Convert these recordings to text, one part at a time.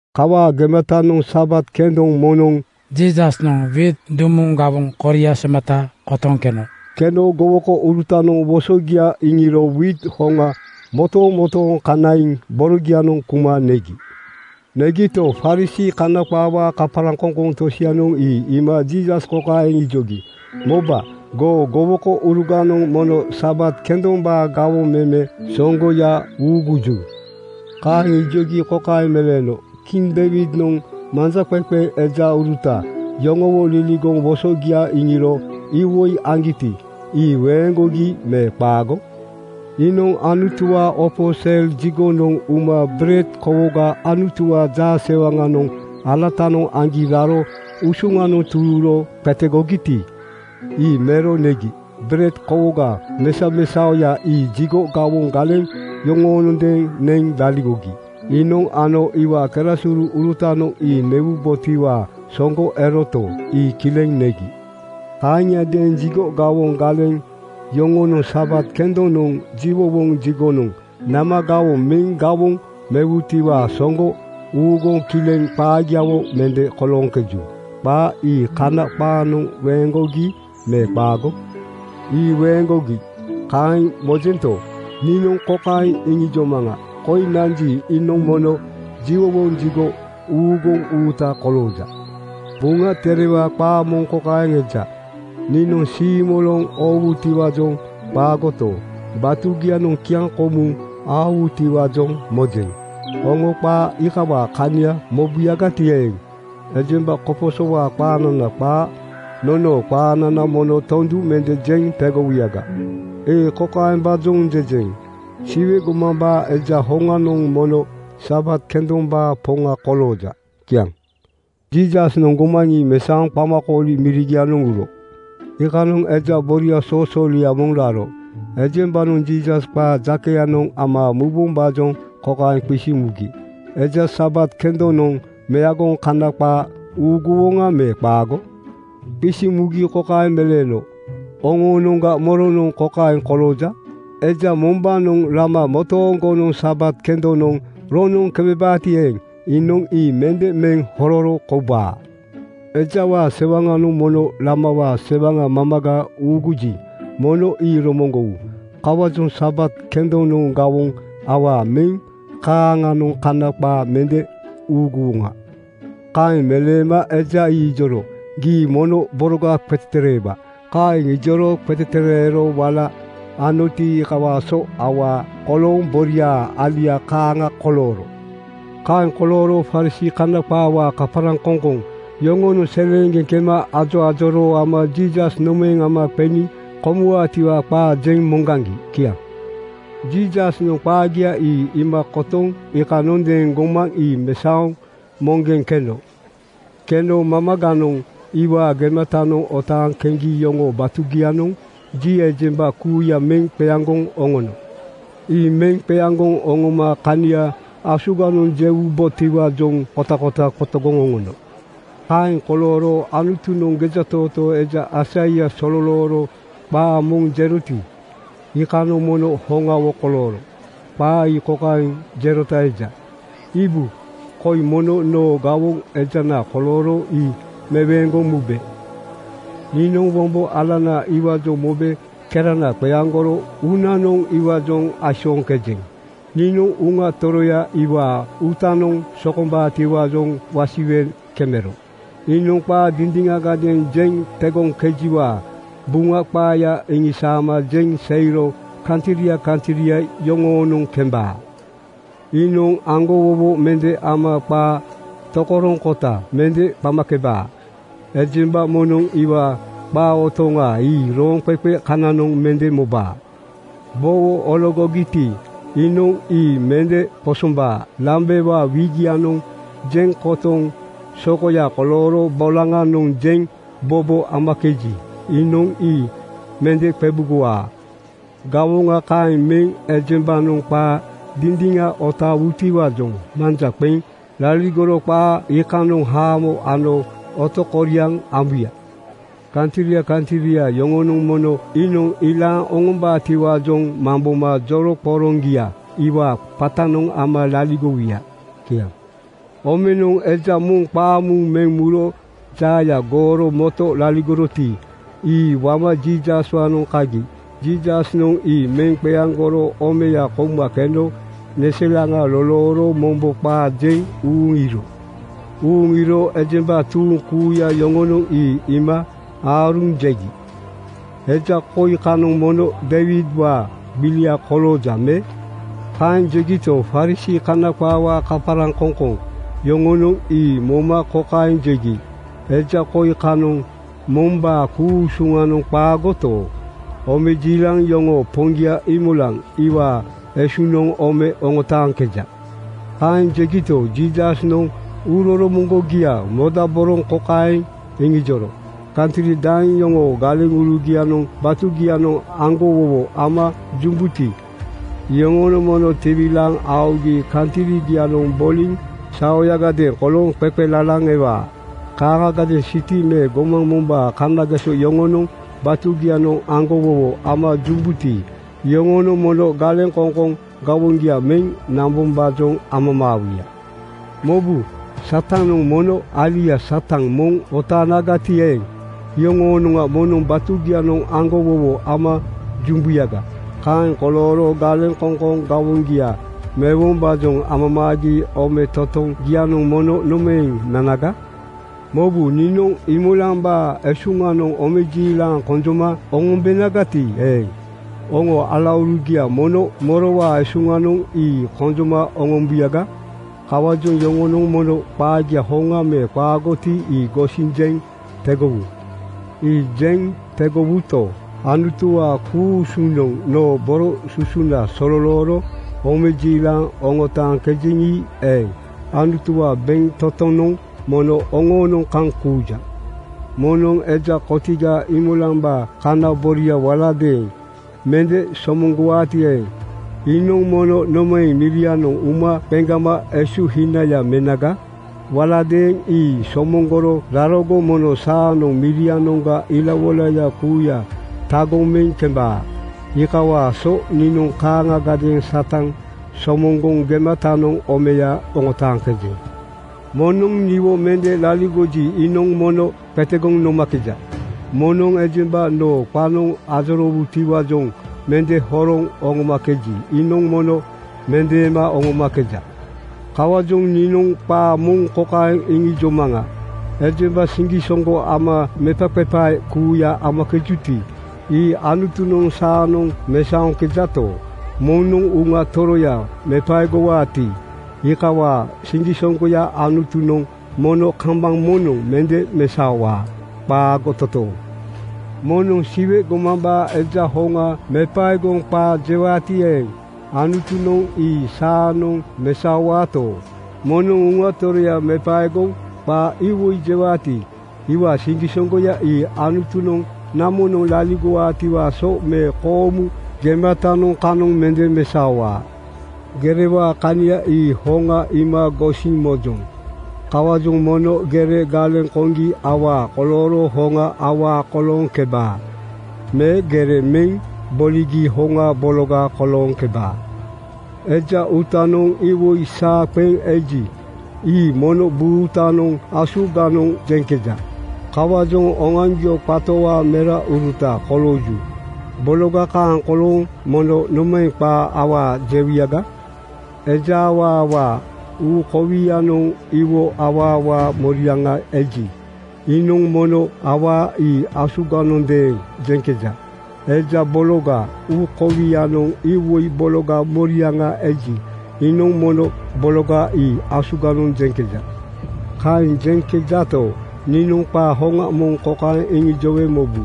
Kawaa gematanoŋ Sabat kendoŋ moŋnoŋ Jiisasnoŋ wiit dumuŋ gawoŋ koria somata kotoŋ keno. Keno gowokourutanoŋ wosogia iŋiro wiit hoŋa motomotooŋ kanaiŋ borogianoŋ kuma negi. Negito, Farisii (Kana qaawaa kaparaŋkoŋkoŋ) tosianoŋ ii iima Jiisas kokaeŋ ijogi, “Moba, goo gowokouruganoŋ mono Sabat kendombaa gawoŋ meme soŋgoya uuguju?” Kaeŋ ijogi kokaeŋ meleeno, “Kiŋ Deiwidnoŋ manjaqeqe ejauruta yoŋowo liligoŋ wosogia iŋiro iwoi aŋgiti, ii weeŋgogi me qaago? Iinoŋ Anutuwaa opo sel jigonoŋ uma bered kowoga Anutuwaa jaasewaŋanoŋ alatanoŋ aŋgi raro esuŋanoŋ tururo qetegogiti, ii mero negi. Bered kowoga mesamesaoya ii jigo gawoŋ galeŋ yoŋonondeeŋ neŋ laligogi. Iinoŋ ano iwaa kerasuru-urutanoŋ ii newubotiwaa soŋgo eroto, ii kileŋ negi. Kaaŋiadeeŋ jigo gawoŋ galeŋ yoŋonoŋ Sabat kendonoŋ jiwowoŋ jigonoŋ nama gawoŋ meŋ gawoŋ mewutiwaa soŋgo uuguŋ kileŋ qaagiawo mende kolooŋkeju. Qaa ii Kana qaanoŋ weeŋgogi me qaago? “Ii weeŋgogi, kaeŋ mojento, niinoŋ kokaeŋ iŋijomaŋa: Koi nanji, iinoŋ mono jiwowoŋ jigo uuguŋ uuta kolooja. Buŋa Terewaa qaa moŋ kokaeŋ eja, “Niinoŋ siimoloŋ oowutiwaajoŋ qaagoto, batugianoŋ kiaŋkomuŋ aowutiwaajoŋ mojeŋ.” Oŋo qaa iikawaa kania mobuyagati eeŋ, ejemba koposowaa qaanana qaa nonoo qaanana mono tondu mende jeŋ tegowuyaga. “Ii kokaembaajoŋ jejeŋ: Siwe gomambaa Eja hoŋanoŋ mono Sabat kendombaa Poŋa kolooja.” Kiaŋ. Jiisasnoŋ gomaŋ ii mesaoŋ qamakooli mirigianoŋ uro. Iikanoŋ eja boria soosoolia moŋ raro. Ejembanoŋ Jiisas qaa jakeyanoŋ ama mubombaajoŋ kokaeŋ qisiŋ mugi, “Eja Sabat kendonoŋ meagoŋ Kana qaa uuguwoŋa me qaago?” Qisiŋ mugi kokaeŋ meleeno, “Oŋoonoŋga moronoŋ kokaeŋ kolooja: Eja mombaanoŋ lama motooŋgonoŋ Sabat kendonoŋ roŋnoŋ kemebaati eeŋ, iinoŋ ii mende meŋ hororo koubaa? Ejawaa sewaŋanoŋ mono lamawaa sewaŋa mamaga uuguji, mono ii romoŋgowu. Kawaajoŋ Sabat kendonoŋ gawoŋ awaa meŋ kaaŋanoŋ Kana qaa mende uuguwoŋa.” Kaeŋ meleema eja ii ijoro, “Gii mono boroga qetetereewa.” Kaeŋ ijoro qetetereero wala anoti, iikawaa so awaa kolooŋ boria alia kaaŋa kolooro. Kaeŋ kolooro Farisii (Kana qaawaa kaparaŋkoŋkoŋ) yoŋonoŋ seleeŋgeŋ kema ajoajoroo ama Jiisas nomaeŋ ama qeniŋ komuwaatiwaa qaa jeŋ moŋgaŋgi. Kiaŋ. Jiisasnoŋ qaagia ii iima kotoŋ iikanondeeŋ gomaŋ ii mesaoŋ moŋgeŋ keno. Keno mamaganoŋ iwaa gematanoŋ otaaŋ keŋgi yoŋoo batugianoŋ ji ejemba kuuya meŋ qeaŋgoŋ oŋono. Ii meŋ qeaŋgoŋ oŋoma kania asuganoŋ jewubotiwaajoŋ kotakota qotogoŋ oŋono. Kaeŋ kolooro Anutunoŋ gejatootoo eja Aisaia sololooro qaa moŋ jeroti, iikanoŋ mono hoŋawo kolooro. Qaa ii kokaeŋ jerota eja, “Iibu, koi mono noo gawoŋ ejana kolooro ii meweeŋgoŋ mube. Niinoŋ wombo alana iwaajoŋ mobe kerana qeaŋgoro uunanoŋ iwaajoŋ aisooŋkejeŋ. Niinoŋ Uŋana Toroya iwaa uuta sokombaatiwaajoŋ wasiwe kemero iinoŋ qaa dindiŋagadeeŋ jeŋ tegoŋkejeŋiwaa Buŋa qaaya iŋisaama jeŋ seiro kantria kantria yoŋoonoŋ kembaa. Iinoŋ aŋgowowo mende ama qaa tokoroŋkota mende qamakebaa. Ejemba moŋnoŋ iwaa qa otoŋa ii rooŋqeqe kananoŋ mende mobaa. Bowo ologogiti, iinoŋ ii mende qosombaa. Lambewaa wikyanoŋ jeŋ kotoŋ sokoya kolooro bolaŋanoŋ jeŋ bobo amakeji, iinoŋ ii mende qebugowaa. Gawoŋa kaeŋ meŋ ejembanoŋ qaa dindiŋa otaawutiwaajoŋ manja qeŋ laligoro qaa iikanoŋ haamo ano otokoriaŋ ambuya. Kantria kantria yoŋonoŋ mono iinoŋ ilaaŋ oŋombaatiwaajoŋ mamboma joroŋqoroŋgia iwaa qatanoŋ ama laligowuya.” Kiaŋ. Omenoŋ eja moŋ qaamuuŋ meŋ muro jaaya gooro moto laligoroti, ii wama Jiisaswaanoŋ kagi. Jiisasnoŋ ii meŋ qeaŋgoro omeya kouma keno neselaŋa lolooro mombo qaa jeŋ uuŋ iiro. Uuŋ iiro ejemba tuuŋ kuuya yoŋonoŋ ii iima aaruŋ jegi, “Eja koi kanoŋ mono Deiwidwaa gbilia kolooja me?” Kaeŋ jegito, Farisii (Kana qaawaa kaparaŋkoŋkoŋ) yoŋonoŋ ii moma kokaeŋ jegi, “Eja koi kanoŋ mombaa ku-usunoŋ qaagoto, omejiilaŋ yoŋoo Poŋgia Iimolaŋ iwaa esuŋnoŋ ome oŋotaaŋkeja.” Kaeŋ jegito, Jiisasnoŋ uuroromoŋgogia modaboroŋ kokaeŋ iŋijoro, “Kantri daeŋ yoŋoo galeŋurugianoŋ batugianoŋ aŋgowowo ama jumbuti, iyoŋonoŋ mono tiwilaaŋ aogi kantrigianoŋ boliŋ saoyagadeeŋ kolooŋ qeqelalaŋ ewaa. Kaaŋagadeeŋ siti me gomaŋ mombaa kanageso yoŋonoŋ batugianoŋ aŋgowowo ama jumbuti, iyoŋonoŋ mono galeŋkoŋkoŋ gawoŋgia meŋ nambombaajoŋ amamaawuya. “Mobu, Satanoŋ mono alia Satan moŋ otaanagati eeŋ, iyoŋonoŋ mono batugianoŋ aŋgowowo ama jumbuyaga. Kaeŋ kolooro galeŋkoŋkoŋ gawoŋgia mewombaajoŋ amamaagi ometotoŋgianoŋ mono nomaeŋ nanaga? “Mobu, niinoŋ Iimolambaa esuŋnoŋ omejiilaŋ konjoma oŋombenagati eeŋ, oŋoo alaurugianoŋ mono morowaa esuŋnoŋ ii konjoma oŋombuyaga? Kawaajoŋ yoŋonoŋ mono qaagia hoŋa me qaagoti, ii gosiŋ jeŋ tegowu. Ii jeŋ tegowuto, Anutuwaa ku-usunoŋ noo boro susuna sololooro omejiilaŋ oŋotaaŋkejeŋi eeŋ, Anutuwaa bentotonoŋ mono oŋoonoŋ kaŋ kuuja. Moŋnoŋ eja kotiga Iimolambaa kana boria waladeeŋ mende somoŋgowaati eeŋ, iinoŋ mono nomaeŋ mirianoŋ uma qeŋgama esuhinaya menaga? Waladeeŋ ii somoŋgoro rarogo mono saanoŋ mirianoŋga ilawoilaya kuuya tagoŋ meŋ kembaa. (Iikawaa so niinoŋ kaaŋagadeeŋ Satan somoŋgoŋ gematanoŋ omeya oŋotaaŋkejeŋ.) “Moŋnoŋ niwo mende laligoji, iinoŋ mono qetegoŋ nomakeja. Moŋnoŋ ejemba noo qanoŋ ajoroowutiwaajoŋ mende horoŋ oŋomakeji, iinoŋ mono mendeema oŋomakeja. Kawaajoŋ niinoŋ qaa moŋ kokaeŋ iŋijomaŋa: Ejemba siŋgisoŋgo ama mepaqepae kuuya amakejuti, ii Anutunoŋ saanoŋ mesaoŋkejato, moŋnoŋ Uŋa Toroya mepaegowaati, iikawaa siŋgisoŋgoya Anutunoŋ mono kambaŋ moŋnoŋ mende mesaowaa. Qaago totooŋ! “Moŋnoŋ Siwe gomambaa Eja hoŋa mepaegoŋ qaa jewaati eeŋ, Anutunoŋ ii saanoŋ mesaowaato, moŋnoŋ Uŋa Toroya mepaegoŋ qaa iwoi jewaati, iwaa siŋgisoŋgoya ii Anutunoŋ namonoŋ laligowaatiwaa so me koomu gematanoŋ kanoŋ mende mesaowaa. “Gerewaa kania ii hoŋa iima gosiŋ mojoŋ. Kawaajoŋ mono gere galeŋ koŋgi awaa kolooro hoŋa awaa kolooŋkebaa me gere meŋ boligi hoŋa bologa kolooŋkebaa. Eja uutanoŋ iwoi saa qeŋ eji, ii mono buutanoŋ asuganoŋ jeŋkeja. Kawaajoŋ oŋoaŋgio qatowaa merauruta kolooju. Bologa kaaŋ kolooŋ mono nomaeŋ qaa awaa jewuyaga? Eja awaawaa uu kowianoŋ iwoi awaawaa moriaŋa eji, iinoŋ mono awaa ii asuganondeeŋ jeŋkeja. Eja bologaa uu kowianoŋ iwoi bologaa moriaŋa eji, iinoŋ mono bologa ii asuganoŋ jeŋkeja. “Kaeŋ jeŋkejato, niinoŋ qaa hoŋa moŋ kokaeŋ iŋijowe mobu: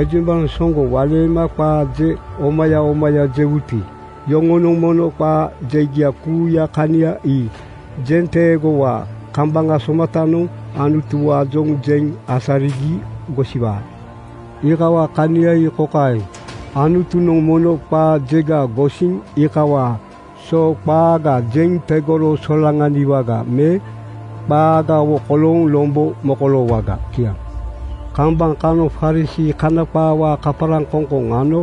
Ejembanoŋ soŋgo waleema qaa je omaya omaya jewuti, iyoŋonoŋ mono qaa jegia kuuyaa kania ii jenteegowaa kambaŋ somatanoŋ Anutuwaajoŋ jeŋ asarigi gosiwaa. Iikawaa kania ii kokaeŋ: Anutunoŋ mono qaa jega gosiŋ iikawaa so qaaga jeŋ tegoro solaŋaniwaga me qaagawo kolooŋ lombo mokoloowaga. Kiaŋ. Kambaŋ kanoŋ Farisii (Kana qaawaa kaparaŋkoŋkoŋ) ano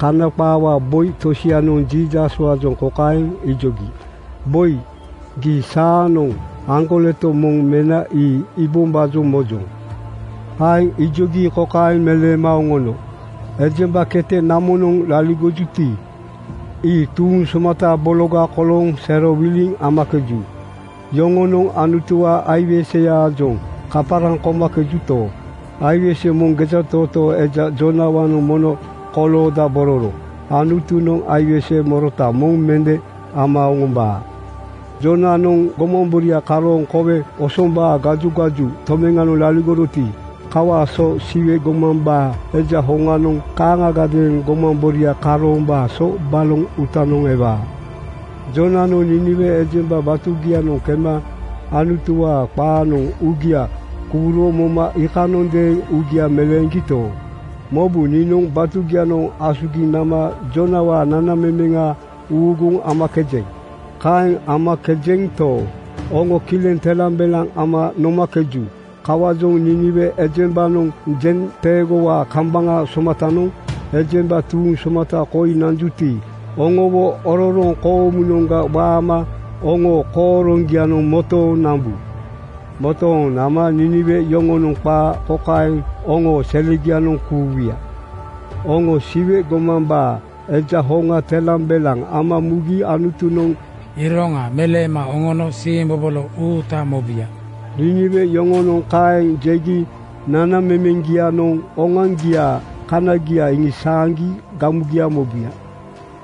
Kana qaawaa boi tosianoŋ Jiisaswaajoŋ kokaeŋ ijogi, “Boi, gii saanoŋ aŋgoleto moŋ mena ii iibombaajoŋ mojoŋ.” Kaeŋ ijogi kokaeŋ meleema oŋono, “Ejemba kete namonoŋ laligojuti, ii tuuŋ somata bologa kolooŋ serowiliŋ amakeju. Yoŋonoŋ Anutuwaa aiweseyaajoŋ kaparaŋ komakejuto, aiwese moŋ gejatootoo eja Joonawaanoŋ mono koloodabororo. Anutunoŋ aiwese morota moŋ mende ama oŋombaa. Joonanoŋ gomamboria karooŋ kowe osombaa (gajugaju) tomeŋanoŋ laligoroti, kawaa so Siwe gomambaa Eja hoŋanoŋ kaaŋagadeeŋ gomamboria karoombaa so baloŋ uutanoŋ ewaa. “Joonanoŋ Niiniwe ejemba batugianoŋ kema Anutuwaa qaanoŋ uugia kuuro moma iikanondeeŋ uugia meleeŋgito, mobu, niinoŋ batugianoŋ asugiŋ nama Joonawaa nanamemeŋa uuguŋ amakejeŋ. Kaeŋ amakejento, oŋo kileŋ telambelaŋ ama nomakeju. Kawaajoŋ Niiniwe ejembanoŋ jenteegowaa kambaŋ somatanoŋ ejemba tuuŋ somata koi nanjuti, oŋowo ororoŋ koomunoŋga waama oŋoo kooroŋgianoŋ motooŋ nambu. Motooŋ nama Niiniwe yoŋonoŋ qaa kokaeŋ oŋoo selegianoŋ kuuwuya, ‘Oŋo Siwe gomambaa Eja hoŋa telambelaŋ ama mugi Anutunoŋ iroŋa meleema oŋono siimbobolo uuta mobuya.’ Niiniwe yoŋonoŋ kaeŋ jegi nanamemeŋgianoŋ oŋoaŋgiaa kaniagia iŋisaaŋgi gamugia mobuya.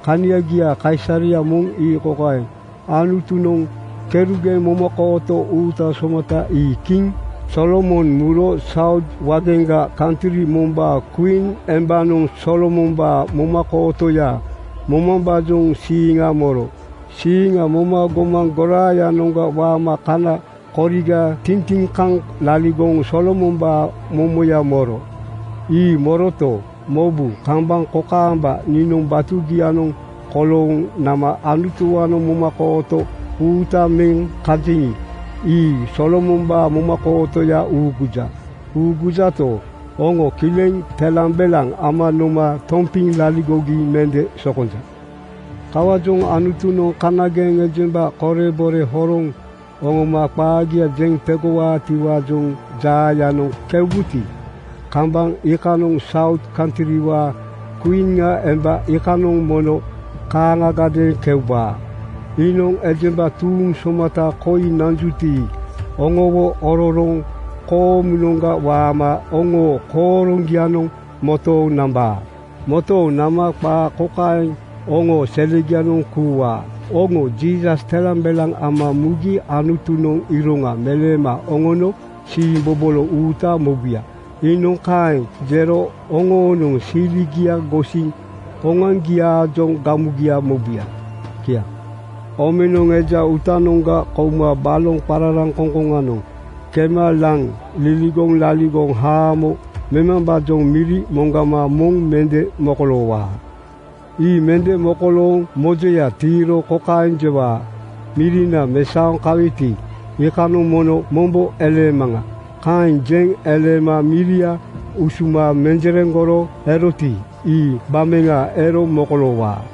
“Kaniagiaa kaisareya moŋ ii kokaeŋ: Anutunoŋ kerugeŋ momakooto uuta somata ii kiŋ Solomon muro Saut waageŋga kantri mombaa kwiin embanoŋ Solomombaa momakootoya momambaajoŋ siiŋa moro. Siiŋa moma gomaŋ goraayanoŋga waama kana koriga tintiŋ kaŋ laligoŋ Solomombaa momoya moro. “Ii moroto, mobu, kambaŋ kokaamba niinoŋ batugianoŋ kolooŋ nama Anutuwaanoŋ momakooto uuta meŋ kajeŋi, ii Solomombaa momakootoya uuguja. Uugujato, oŋo kileŋ telambelaŋ ama noma tompiŋ laligogi mende sokonja. Kawaajoŋ Anutunoŋ kanageŋ ejemba korebore horoŋ oŋoma qaagia jeŋ tegowaatiwaajoŋ jaayanoŋ keubuti, kambaŋ iikanoŋ Saut kantriwaa kwiin emba iikanoŋ mono kaaŋagadeeŋ keubaa. Iinoŋ ejemba tuuŋ somata koi nanjuti, oŋowo ororoŋ koomunoŋga waama oŋoo kooroŋgianoŋ motooŋ nambaa. Motooŋ nama qaa kokaeŋ oŋoo selegianoŋ kuuwaa, ‘Oŋo Jiisas telambelaŋ ama mugi Anutunoŋ iroŋa meleema oŋono siimbobolo uuta mobuya.’ Iinoŋ kaeŋ jero oŋonoŋ siligia gosiŋ oŋoaŋgiaajoŋ gamugia mobuya. Kiaŋ. “Omenoŋ eja uutanoŋga kouma baloŋ qararaŋkoŋkoŋanoŋ kema laŋ liligoŋ laligoŋ haamo memambaajoŋ miri moŋgama moŋ mende mokoloowaa. Ii mende mokolooŋ mojoya tiiro kokaeŋ jewaa, ‘Mirina mesaoŋ kaweti, iikanoŋ mono mombo eleemaŋa.’ Kaeŋ jeŋ eleema miria usuma menjereŋgoro eroti, ii gbameŋa ero mokoloowaa.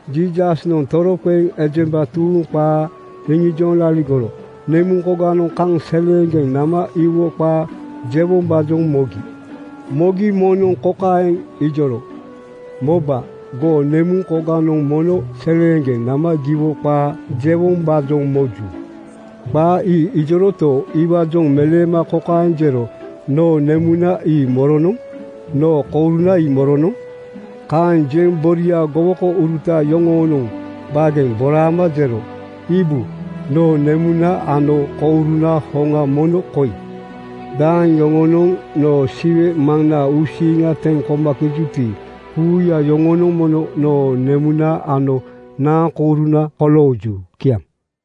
Jiisasnoŋ toroqeŋ ejemba tuuŋ qaa iŋijoŋ laligoro nemuŋkoganoŋ kaŋ seleeŋgeŋ nama iwo qaa jewombaajoŋ mogi. Mogi moŋnoŋ kokaeŋ ijoro, “Moba, goo nemuŋkoganoŋ mono seleeŋgeŋ nama giwo qaa jewombaajoŋ moju.” Qaa ii ijoroto, iwaajoŋ meleema kokaeŋ jero, “Noo nemuna ii moronoŋ? Noo kouruna ii moronoŋ?” Kaeŋ jeŋ boria gowokouruta yoŋoonoŋ baageŋ boraama jero, “Iibu, noo nemuna ano kouruna hoŋa mono koi. Daeŋ yoŋonoŋ noo Siwe Maŋnaa uusiiŋa teŋ komakejuti, kuuya iyoŋonoŋ mono noo nemuna ano naaŋkouruna kolooju.” Kiaŋ.